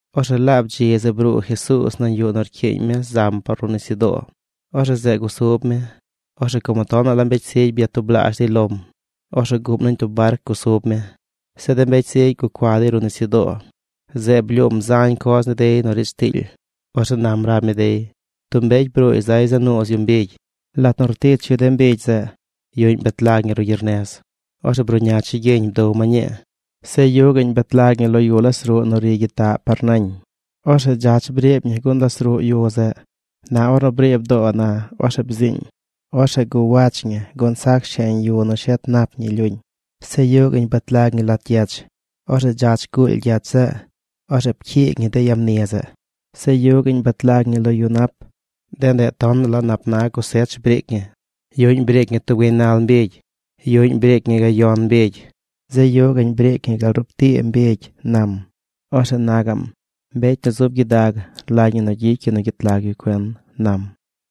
Orzeꞌ laab dzi zeꞌ bruu Jesuuz nañ yuꞌ nu rcyiiñ mi zam par ruꞌ nisyudoo. Orzeꞌ zeꞌ gusub mi. Orzeꞌ como tonaꞌ la mbecy zigy byatublaazh dey lom, orzeꞌ guꞌm nañ tub barc gusub mi. Zeꞌ de mbecy zigy gucua dey ruꞌ nisyudoo. Zeꞌ blyuum zañ coz ni dey nu riidz tiily. Orzeꞌ nam rab mi dey: ―Tub mbecy bruuy zay za nuuz yu mbigy. Lat nu rtich yu de mbigy zeꞌ, yuꞌñ bet lag ñi ruꞌ gyernez, orzeꞌ bruꞌña chigyiñ bdow ma ñii. Zeꞌ yuꞌ gaꞌñ bet lag ñi lo yu las ruꞌ nu ri gyitaꞌ par nañ. Orzeꞌ dzach briib ñi gun las ruꞌ yu zeꞌ. Na ornu briib doo na, orzeꞌ bziiñ. Orzeꞌ guwach ñi gun sac sheñ yu nu shet nap ñi lyuñ. Zeꞌ yuꞌ gaꞌñ bet lag ñi lat gyech. Orzeꞌ dzach guuly gyech zeꞌ. Orzeꞌ pcyiig ñi de yamni zeꞌ. Zeꞌ yuꞌ gaꞌñ bet lag ñi lo yu nap. De ndeꞌ tonaꞌ la nap na cosech briic ñi. Yuꞌñ briic ñi tub gaynal mbigy. Yuꞌñ briic ñi gayon mbigy. Zeꞌ yuꞌ gaꞌñ briic ñi gal rup tii mbigy ―nam. Orzeꞌ na gaꞌm: ―Mbecy nu zub gyidag rlagy ñi gyicy yu nu gyet lag yu cuen ―nam.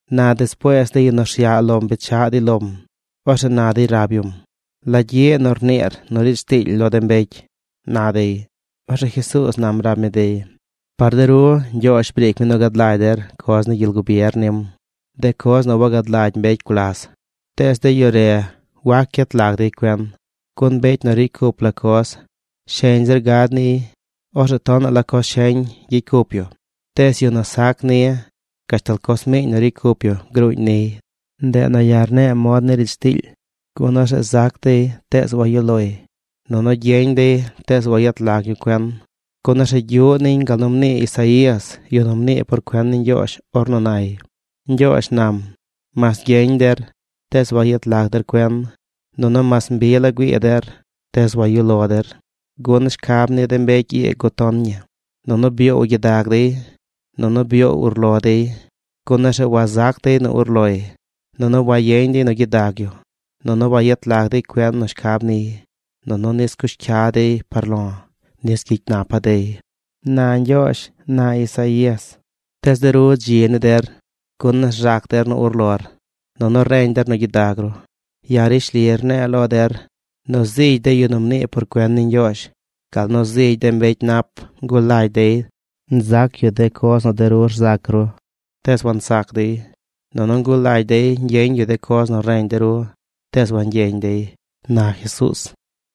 Na despuees de yu nu rsyaꞌ lom bechaꞌ dey lom, orzeꞌ na dey rab yum: ―¿La gyiꞌ nu rniir nu riidz tiily lo de mbecy? ―na dey. Orzeꞌ Jesuuz nam rab mi dey: ―Par de ru Ñgyoozh briic mi nu gad lagy der coz ni gyel gubier nim, de coz nu wagad lagy mbecy gulas. Tees de yu re wac gyet lag dey cuen. Gun mbecy nu ricy cup la coz, sheñ zir gad niy. Orzeꞌ tonaꞌ la coz sheñ gyicy cup yu. Tees yu nu sac ni, gashtal coz miiñ nu ricy cup yu gruuñ niy. Ndeꞌ nu ya̱ rne̱e̱ mod ni riidz tiily, gun orzeꞌ zac dey tees wayuꞌ loy, nunu gyeñ dey tees wayet lag yu cuen. Gun orzeꞌ gyuꞌ niñ gal nu mnii Isaías, yu nu mnii por cuen ni Ñgyoozh ornu nay: Ñgyoozh nam: “Mas gyeñ der, tees wayet lag der cuen. Nunu mas mbi la güii der, tees wayuꞌ lo der. Gun shcab ni de mbecy ii guton ñi, nunu byoow gyidag dey, nunu byoow urlo dey. Gun orzeꞌ wazac dey nu urloy, nunu wayeñ dey nu gyidag yu, nunu wayet lag dey cuen nu shcab niy, nunu nis cush cya dey par lo̱, nis gyicy napa̱ dey”, na Ñgyoozh, na Isaías. ’Tees de ru dzi ni der, gun rzac der nu urlor, nunu reñ der nu gyidag ru. Ya̱ rishli rne̱e̱ lo der nu zigy de yu nu mnii por cuen ni Ñgyoozh gal nu zigy de mbecy nap ngulagy dey nzac yu de coz nu de ru rzac ru, tees wansac dey. Nunu ngulagy dey ñgyeñ yu de coz nu reñ de ru, tees wangyeñ dey ―na Jesuuz―.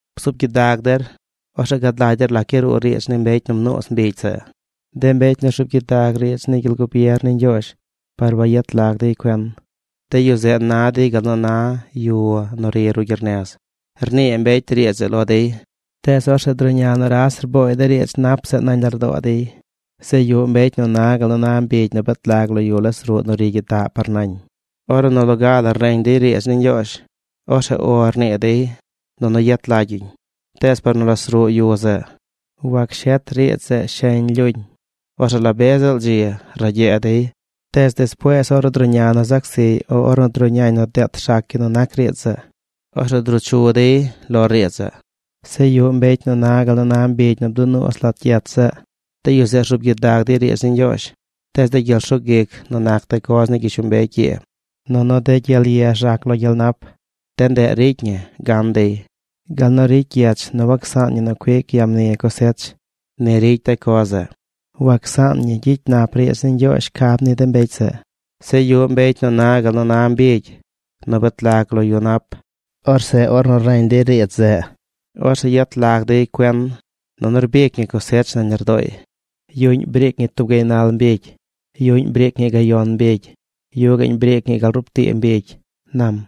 ’Bzuub gyidag der. Orzeꞌ gad lagy der lac yaruu riidz ni mbecy nu mnuuz mbigy zeꞌ. De mbecy nu rzuub gyidag riidz ni gyel gubier ni Ñgyoozh par wayet lag dey cuen, de yu zeꞌ na dey gal nu na yu nu ri ruꞌ gyernez. Rnii mbecy riidz zeꞌ lo dey, tees orzeꞌ druꞌña nuras rbooy de riidz nap zeꞌ nañ lardoo dey. Zeꞌ yuꞌ mbecy nu na gal nu na mbigy nu bet lag lo yu las ruꞌ nu ri gyitaꞌ par ñañ. Ornu nu loga la reñ dey riidz ni Ñgyoozh, orzeꞌ “O” rnii dey nunu yet lagy yuñ. Tees par nu las ruꞌ yu zeꞌ, wac shet riidz zeꞌ sheñ lyuñ. Orzeꞌ la be ziꞌl dzi ragyee dey. Tees despuees, ornu druꞌña nu zac ziy o ornu druꞌñañ nu deet rzac yu nu nac riidz zeꞌ, orzeꞌ druu chu dey lo riidz zeꞌ. Zeꞌ yuꞌ mbecy nu na gal nu na mbigy nu bdunuuz lat gyech zeꞌ. De yu zeꞌ rzuub gyidag dey riidz ni Ñgyoozh. Tees de gyel rsug ic nu nac de coz ni gyishlombecy ii nunu de gyel ye rzac lo gyel nap, de ndeꞌ ricy ñi gan dey. Gal nu ricy gyech nu wacsaan ñi nu cuic ya mni cosech, ni ricy de coz zeꞌ. Wacsaan ñi gyicy nap riidz ni Ñgyoozh shcab ni de mbecy zeꞌ. Zeꞌ yuꞌ mbecy nu na gal nu na mbigy nu bet lag lo yu nap. Orzeꞌ ornu reñ dey riidz zeꞌ, orzeꞌ yet lag dey cuen, nunu rbic ñi cosech nañ lardooy. Yuꞌñ briic ñi tub gaynal mbigy. Yuꞌñ briic ñi gayon mbigy. Yuꞌ gaꞌñ briic ñi gal rup tii mbigy ―nam.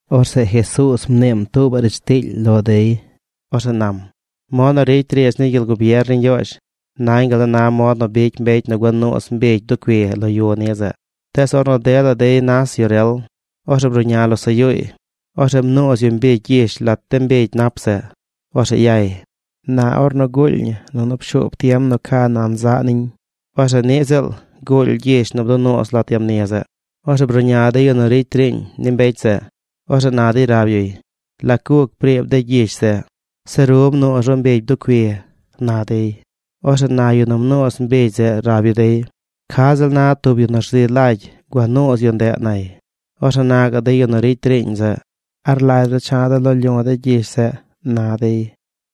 Orzeꞌ Jesuuz mniim tuubaꞌ riidz tiily lo dey. Orzeꞌ nam: ―Mod nu ricy riidz ni gyel gubier ni Ñgyoozh, nañ gal nu na mod nu bicy mbecy nu gua nuuz mbigy bducui lo yu ni zeꞌ. Tees ornu dela dey nas yu rel, orzeꞌ bruꞌña losaꞌ yuuy. Orzeꞌ mnuuz yu mbigy gyish lat de mbigy nap zeꞌ. Orzeꞌ yay. Na ornu guuly ñi nunu pshuub tiem nu ca nan zaꞌ niñ, orzeꞌ niꞌ ziꞌl guuly gyish nu bdunuuz lat yamni zeꞌ. Orzeꞌ bruꞌña de yu nu ricy riiñ ni mbecy zeꞌ. Orzeꞌ na dey rab yuy: “¿Lac guc briib de gyish zeꞌ? Zeꞌ ru mnuuz ru mbigy bducui”, na dey. Orzeꞌ na yu nu mnuuz mbigy zeꞌ rab yu dey: “Ca ziꞌl na tub yu nu rzi lagy gua nuuz yu ndeꞌ”, nay. Orzeꞌ na gaꞌ de yu nu ricy riiñ zeꞌ: “¿A rlagy ru cha̱ de̱ loo lyu̱ de̱ de gyish zeꞌ?” na dey.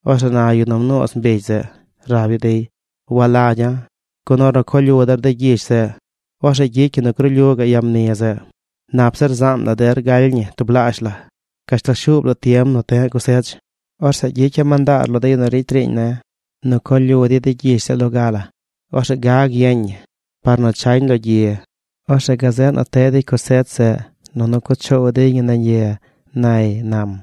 Orzeꞌ na yu nu mnuuz mbigy zeꞌ rab yu dey: “Walagya̱, gun ornu co lyu der de gyish zeꞌ, orzeꞌ gyicy ñi nu gruu lyu gaꞌ ya mni zeꞌ. Nap zir zaan der galy ñi tublaazh la gashtal shuub tiem nu te̱ꞌ cosech. Orzeꞌ gyicya̱ mandaar lo de yu nu ricy riiñ ne̱ nu co lyu dey de gyish zeꞌ loga la. Orzeꞌ gag yeñ ñi par nu chañ lo gyi. Orzeꞌ gazeꞌ nu teꞌ dey cosech zeꞌ nunu cuꞌ choow dey ñi nañ ye”, nay ―nam.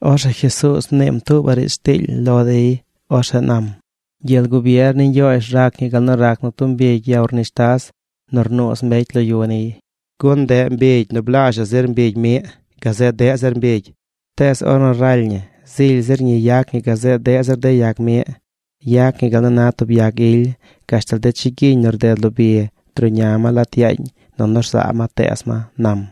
Orzeꞌ Jesuuz mniim tuubaꞌ riidz tiily lo dey. Orzeꞌ nam: ―Gyel gubier ni Ñgyoozh rac ñi gal nu rac nu tub mbigy ya urnishtas nu rnuuz mbecy lo yu niy, gun ndeꞌ mbigy nu blazhaꞌ zir mbigy miꞌ gazeꞌ deꞌ zir mbigy. Tees ornu raly ñi zily zir ñi yac ñi gazeꞌ deꞌ zir de yag miꞌ. Yac ñi gal nu na tub yag ily. Gashtal de chigyiñ nu rded lo bi druꞌña ma lat yaañ, nunu rzaa ma teez ma ―nam.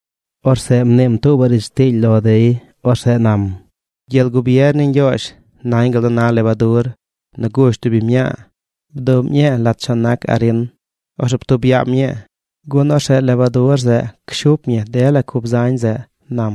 Orzeꞌ mniim tuubaꞌ riidz tiily lo dey. Orzeꞌ nam: ―Gyel gubier ni Ñgyoozh nañ gal nu na lebadur nu gush tub biñ mñaa. Bduꞌm ñii lat chon nac arin. Orzeꞌ ptub yaam ñii, gun orzeꞌ lebadur zeꞌ cshup ñi dela cub zañ zeꞌ ―nam.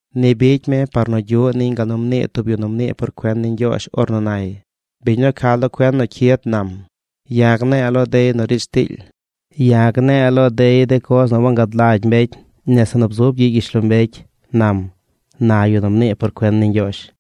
Ni bicy mi par nu gyuꞌ niñ gal nu mnii tub yu nu mnii por cuen ni Ñgyoozh ornu nay: Biñ nu ca lo cuen nu cyid nam: “Ya̱ gne̱e̱ lo dey nu riidz tiily. Ya̱ gne̱e̱ lo dey de coz nu wangad lagy mbecy nese nu bzub gyiꞌ gyishlombecy”, nam, na yu nu mnii por cuen ni Ñgyoozh.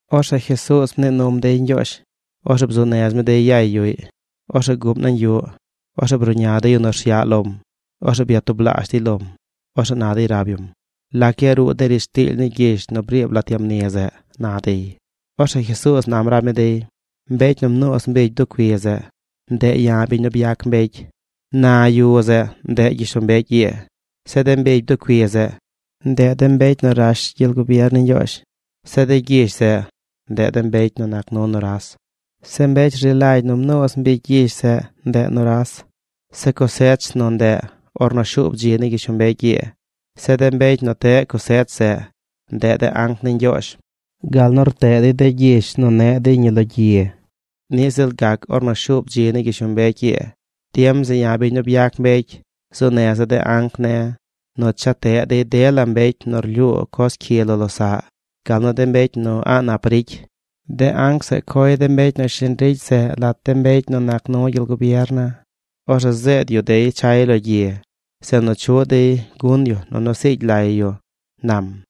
Orzeꞌ Jesuuz mnii num dey ñgyoozh, orzeꞌ bzuu nez mi dey yay yuꞌy. Orzeꞌ guꞌm nañ yuꞌ. Orzeꞌ bruꞌña de yu nu rsyaꞌ lom. Orzeꞌ byatublaazh dey lom. Orzeꞌ na dey rab yum: ―¿Lac yaruu de riidz tiily ni gyish nu briib lat ya mni zeꞌ? ―na dey. Orzeꞌ Jesuuz nam rab mi dey: ―Mbecy nu mnuuz mbigy bducui zeꞌ, ndeꞌ ya̱ biñ nu byac mbecy. Na yu zeꞌ ndeꞌ gyishlombecy ii. Zeꞌ de mbigy bducui zeꞌ, ndeꞌ de mbecy nu rash gyel gubier ni Ñgyoozh. Zeꞌ de gyish zeꞌ, ndeꞌ de mbecy nu nac nu nuras. Zeꞌ mbecy rzi lagy nu mnuuz mbigy gyish zeꞌ, ndeꞌ nuras. Zeꞌ cosech zeꞌ nu ndeꞌ ornu shuub dzi ni gyishlombecy ii. Zeꞌ de mbecy nu teꞌ cosech zeꞌ, ndeꞌ de anc ni Ñgyoozh. Gal nu rteꞌ dey de gyish nu neꞌ dey ñi lo gyi, niꞌ ziꞌl gac ornu shuub dzi ni gyishlombecy ii. Tiem zeꞌ ya̱ biñ nu byac mbecy zuu neza̱ de anc ne̱ nu cha teꞌ dey dela mbecy nu rlyuu coz cyi lo losaꞌ, gal nu de mbecy nu a̱ꞌ nap ricy. De anc zeꞌ coy de mbecy nu shiñ ricy zeꞌ lat de mbecy nu nac nu gyel gubier ne̱. Orzeꞌ zeed yu dey chay lo gyi. Zeꞌ nu chuꞌ dey gun yu nunu siigy lay yu ―nam―.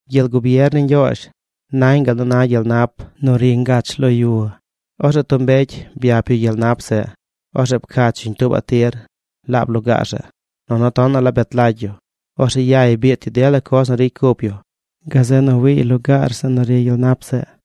’Gyel gubier ni Ñgyoozh nañ gal nu na gyel nap nu ri ngach lo yu. Orzeꞌ tub mbecy byap yu gyel nap zeꞌ. Orzeꞌ pcach yuñ tuubaꞌ tir laab lugaar zeꞌ. Nunu tonaꞌ la bet lagy yu. Orzeꞌ yay biit yu dela coz nu ricy cup yu, gazeꞌ nu wiiy lugaar zeꞌ nu ri gyel nap zeꞌ.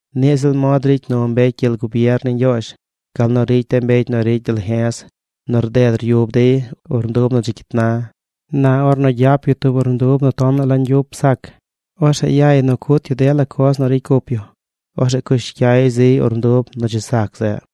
’Niꞌ ziꞌl mod ricy nu mbecy gyel gubier ni Ñgyoozh gal nu ricy de mbecy nu ricy dalje̱z nu rded ryub dey urndub nu dzi cyit na. Na ornu gyap yu tub urndub nu tonaꞌ la ñgyup sac, orzeꞌ yay nu cut yu dela coz nu ricy cup yu. Orzeꞌ cush cyay ziy urndub nu dzi sac zeꞌ.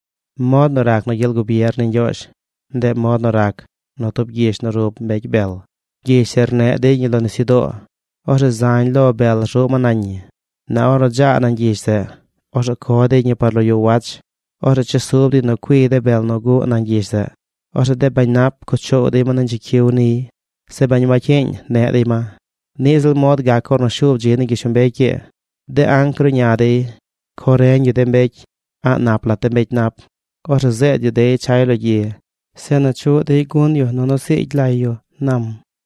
’Mod nu rac nu gyel gubier ni Ñgyoozh, ndeꞌ mod nu rac nu tub gyish nu rub mbecy bel. Gyish zeꞌ rneꞌ dey ñi lo nisyudoo. Orzeꞌ zañ lo bel rzuꞌ ma nañ ñi. Na ornu dzaa nañ gyish zeꞌ, orzeꞌ co dey ñi par lo yu wach. Orzeꞌ chesub dey nu cuiy de bel nu guꞌ nañ gyish zeꞌ. Orzeꞌ de bañ nap cuꞌ choow dey ma nañ chicyiw niy. Zeꞌ bañ wacyiiñ neꞌ dey ma. Niꞌ ziꞌl mod gac ornu shuub dzi ni gyishlombecy ii. De anc gruꞌña dey. Co reñ yu de mbecy a̱ꞌ nap lat de mbecy nap. Orzeꞌ zeed yu dey chay lo gyi, zeꞌ nu chuꞌ dey gun yu nunu siigy lay yu ―nam.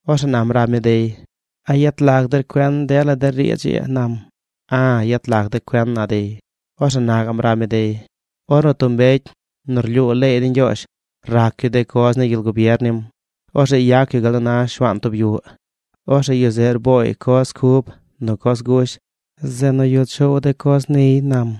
Orzeꞌ nam rab mi dey: ―¿A yet lag der cuen dela de riidz ii? ―nam. ―A̱, yet lag de̱ cuen ―na dey. Orzeꞌ na gaꞌm rab mi dey: ―Ornu tub mbecy nu rlyuu leey ni Ñgyoozh rac yu de coz ni gyel gubier nim, orzeꞌ yac yu gal nu na shuaan tub yuꞌ. Orzeꞌ yu zeꞌ rbooy coz cub nu coz gush zeꞌ nu yuꞌ choow de coz niy ―nam.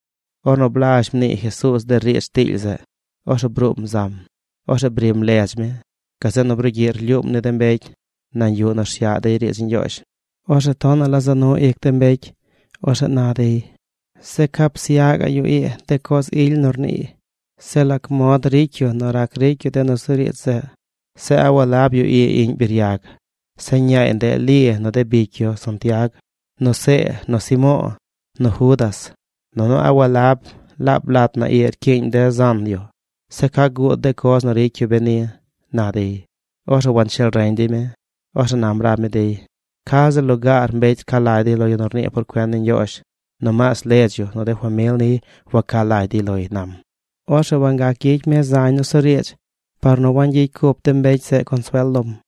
Ornu blazh mnii Jesuuz de riidz tiily zeꞌ, orzeꞌ bruum zam. Orzeꞌ brim ledz mi. Gazeꞌ nu brugyiꞌ rlyuum ni de mbecy nañ yuꞌ nu rsyaꞌ dey riidz ni Ñgyoozh. Orzeꞌ tonaꞌ la za nu ic de mbecy. Orzeꞌ na dey: ―Zeꞌ ¿ca psyaꞌ gaꞌ yu ii de coz ily nu rniiy? Zeꞌ ¿lac mod ricy yu nu rac ricy yu de nusuriidz zeꞌ? Zeꞌ ¿a walab yu ii iꞌñ biryag? Zeꞌ, ñaay ndeꞌ Li nu de bicy yu Santiag, nu See, nu Simo̱o̱, nu Judas. Nunu ¿a walab laab lat na ii rcyiiñ de zan yu? Zeꞌ ¿ca guud de coz nu ricy yu beni? ―na dey. Orzeꞌ wancheel reñ dey mi. Orzeꞌ nam rab mi dey: ―Ca ziꞌl lugaar mbecy rca lagy dey lo yu nu rnii por cuen ni Ñgyoozh. Nomaas ledz yu, nu de famil niy waca lagy dey loy ―nam. Orzeꞌ wangac gyicy mi zañ nusuriidz par nu wangyicy cup de mbecy zeꞌ consuel lom.